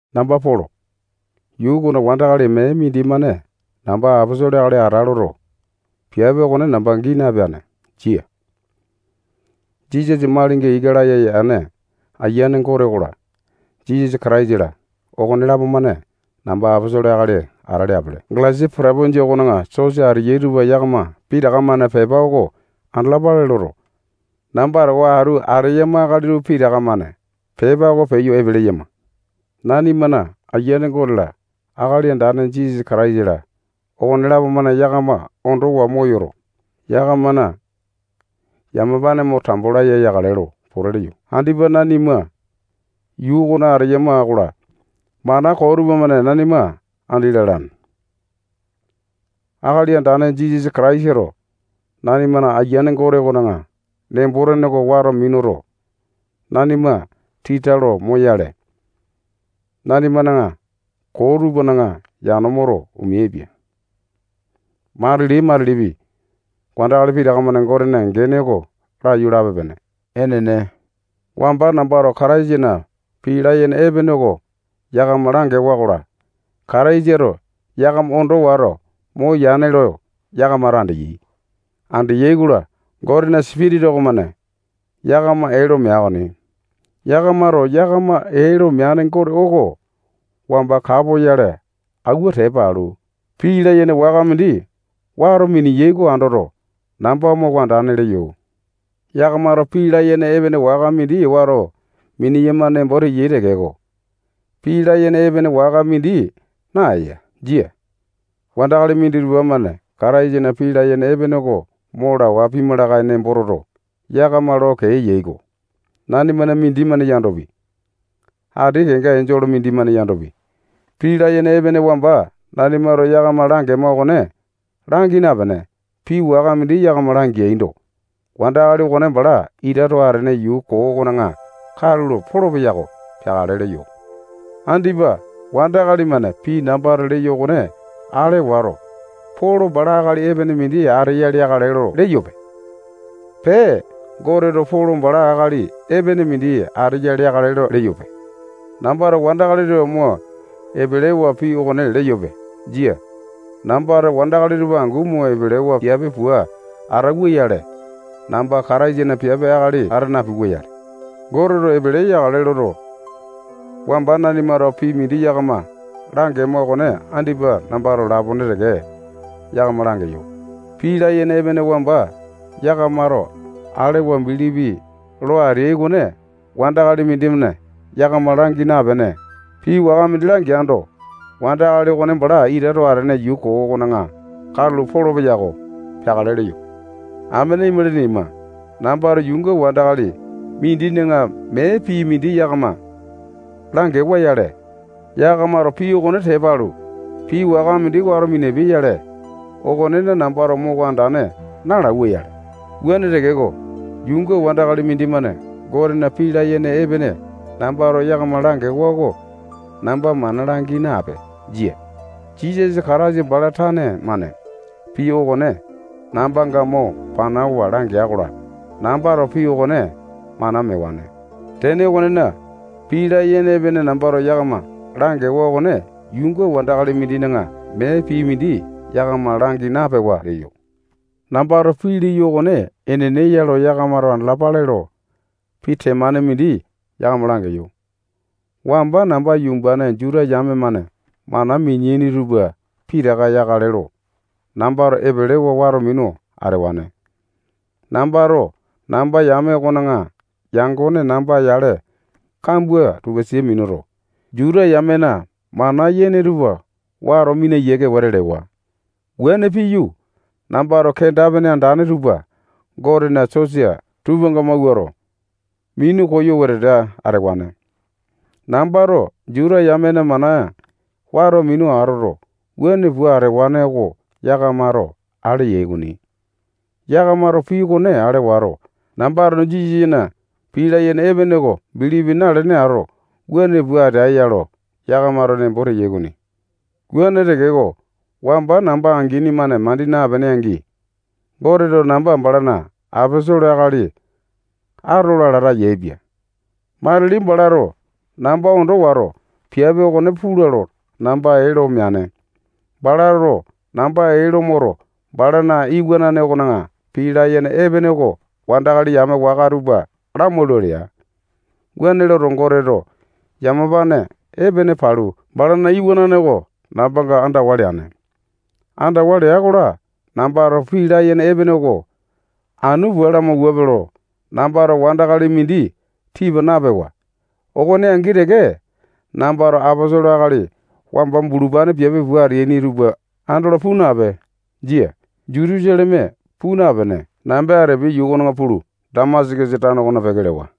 Namba Polo. Yuu okona wandakali mee mindimane namba aposolo akali ata loto, piape okone namba gii napeane. Jia. Jisasa malinga ika laya yane Ayiane Gote okola, Jisasa Kataisa-la, okonelapo-mane namba aposolo akali ata leapele. Galesia potopinjia okona sosa ateyai tupa yakama pitaka-mane pepa oko andalapale loto, namba towa atu ateyama akali tupa pitaka-mane pepa oko peyo epe leyama. Nanimana Aiyane Gote-la, Akali Andane Jisasa Kataisa-la, okonelapo-mane yakama ondowa moyoto, yakamana yamapane mo tambo laya yakale lo pote leyo. Andipa nanima yuu okona ateyama-kola, mana koo tupamane nanima andi lalane. Akali Andane Jisasa Kataisato nanimana Ayiane Gote okona nembo-tene oko wato minuto, nanima tita lo moyale, nanimana koo tupana yano moto, omeaipia. Matili-matilipi, wandakali pitaka-mane Gotena gene oko laiyu lape-pene. Enene. Wamba nambato Kataisana pii layene epene oko yakama langewa-kola, Kataisato yakama ondo wato moyane lo yakamato andeai. Andeai-kola, Gotena Sipitisa okomane yakama ee lo mea okoni. Yakamato yakama ee lo meane Gote oko wamba kapoyale awua tepa alu, pii layene waka mindi wato mineyai oko andoto, namba moko andane leyo. Yakamato pii layene epene waka mindi wato mineyama nembo teyai tekeko, pii layene epene waka mindi naeya. Jia. Wandakali minditupa-mane Kataisana pii layene epene oko mo lawa pima lakae lo nembo toto, yakama lo kee eyai-ko. Nanimana mindimane yandopi, ati kenga enjole mindimane yandopi, pii layene epene wamba nanimato yakama langema okone langi napene, pii waka mindi yakama langeando, wandakali okone bala ita too atene yuu koo okona katulo polopeya-ko. peakale leyo. Andipa wandakali-mane pii nambato leyo okone ale wato, Polo bala akali epene mindi ateya leakale lo leyope. Pee, Goteto Polo bala akali epene mindi ateya leakale lo leyope. Nambato wandakali tupa mo epelewa pii okone leyope. Jia. Nambato wandakali tupa angu mo epelewa piape pua atauwa-yale, namba Kataisana piape akali ata napiwa-yale. Goteto epele yakale loto, wamba nanimato pii mindi yakama langema okone andipa nambato lapone teke yakama langeyo. Pii layene epene wamba yakamato alewa bilipi lo ateai okone wandakali mindimane yakama langi napene, pii waka mindi langeando, wandakali okone bala ita too atene yuu koo okona katulo polopeya-ko. Peakale leyo. Amene imalini ima, nambato yuunga wandakali mindina mee pii mindi yakama langewa-yale, yakamato pii okone tepa alu, pii waka mindi wato minapiai-yale, okonena nambato moko andane nalauwa-yale. Wuane tekeko, yuunga wandakali mindimane Gotena pii layene epene nambato yakama langewa oko namba mana langi nape. Jia. Jisasa Kataisa bala tane-mane pii okone nambanga mo panawa langea-kola, nambato pii okone mana mewane. Tene okonena, pii layene epene nambato yakama langewa okone yuunga wandakali mindina mee pii mindi yakama langi napewa leyo. Nambato pii leyo okone enene ya lo yakamato andalapape lo, pii temane mindi yakama langeyo. Wamba namba yumbane Juta yame-mane mana mineaini tupa pitaka yakale lo, nambato epelewa wato minu atewane. Nambato namba yame okona yangone namba yale kambua tupa sia minuto, Juta yamena mana yene tupa wato mina yiake wete lewa. Wuane piyu, nambato kenda-pene andane tupa Gotena sosa tupanga mawuato, minu koyo wetete atewane. Nambato Juta yamena mana wato minu atoto, wuane pua atewane oko yakamato ale yai okoni. Yakamato pii okone ale wato, nambato Jisasana pii layene epene oko bilipi nalene ato, wuane pua ateae-ya lo, yakamato nembo teai okoni. Wuane tekeko, wamba namba angini-mane mandi napene angi, Goteto namba balana aposolo akali atola lata yaepia. Matili balato namba ondo wato, piape okone pula lo, namba ee lo meane. Balato namba ee lo moto, balana iwanane okona pii layene epene oko wandakali yame waka tupa lamaula lea. Waune loto, Goteto yamapane epene palu, balana iwanane oko nambanga andawa leane. Andawa lea-kola, nambato pii layene epene oko anu pua lamawuape lo, nambato wandakali mindi tipa napewa. Okone angi teke, nambato aposolo akali wamba bulupane piape pua ateaini tupa andolo puu nape. Jia. Jutusaleme puu napene, namba Atepia yuu pulu, Damasakasa tano okona peke lewa.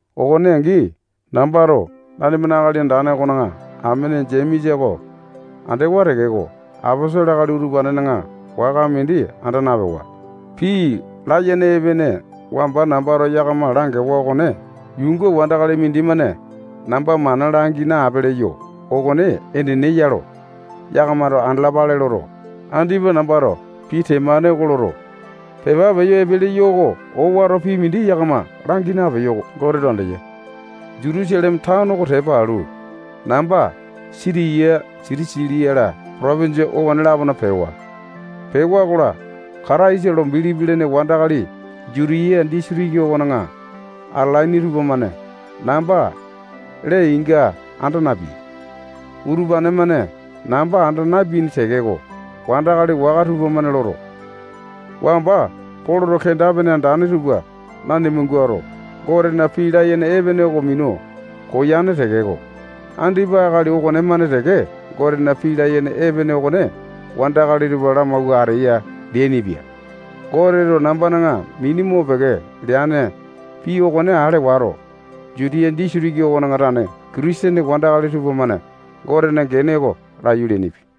Okone angi, nambato nanimana Akali Andane okona amene Jemesa oko andewa tekeko, aposolo akali utupanena waka mindi anda napewa. Pii layene epene wamba nambato yakama langewa okone yuunga wandakali mindimane namba mana langi nape leyo okone enene ya lo yakamato andalapale loto, andipa nambato pii temane oko loto, pepa peyo epe leyo okomane owato pii mindi yakama langi napeyo. Goteto andeya. Jutusaleme tano oko tepa alu, namba Sitiya, Silisia-la, potopinjia okone-lapona pewa. Pewa-kola, Kataisa lo bilipi lene wandakali Jutiya disitiki okona atalaini tupamane nambana lee-inga anda napeai. Utupane-mane namba anda napeaini tekeko, wandakali waka tupamane loto, wamba Poloto kenda-pene andane tupa nanima guato, Gotena pii layene epene oko minu koyane tekeko, andipa akali okonemane teke Gotena pii layene epene okone wandakali tupa lamawua ateya leainipia. Goteto nambana mini mopeke leane pii okone ale wato, Jutia disitiki okona tane Kitisene wandakali tupamane Gotena gene oko laiyu leainipia.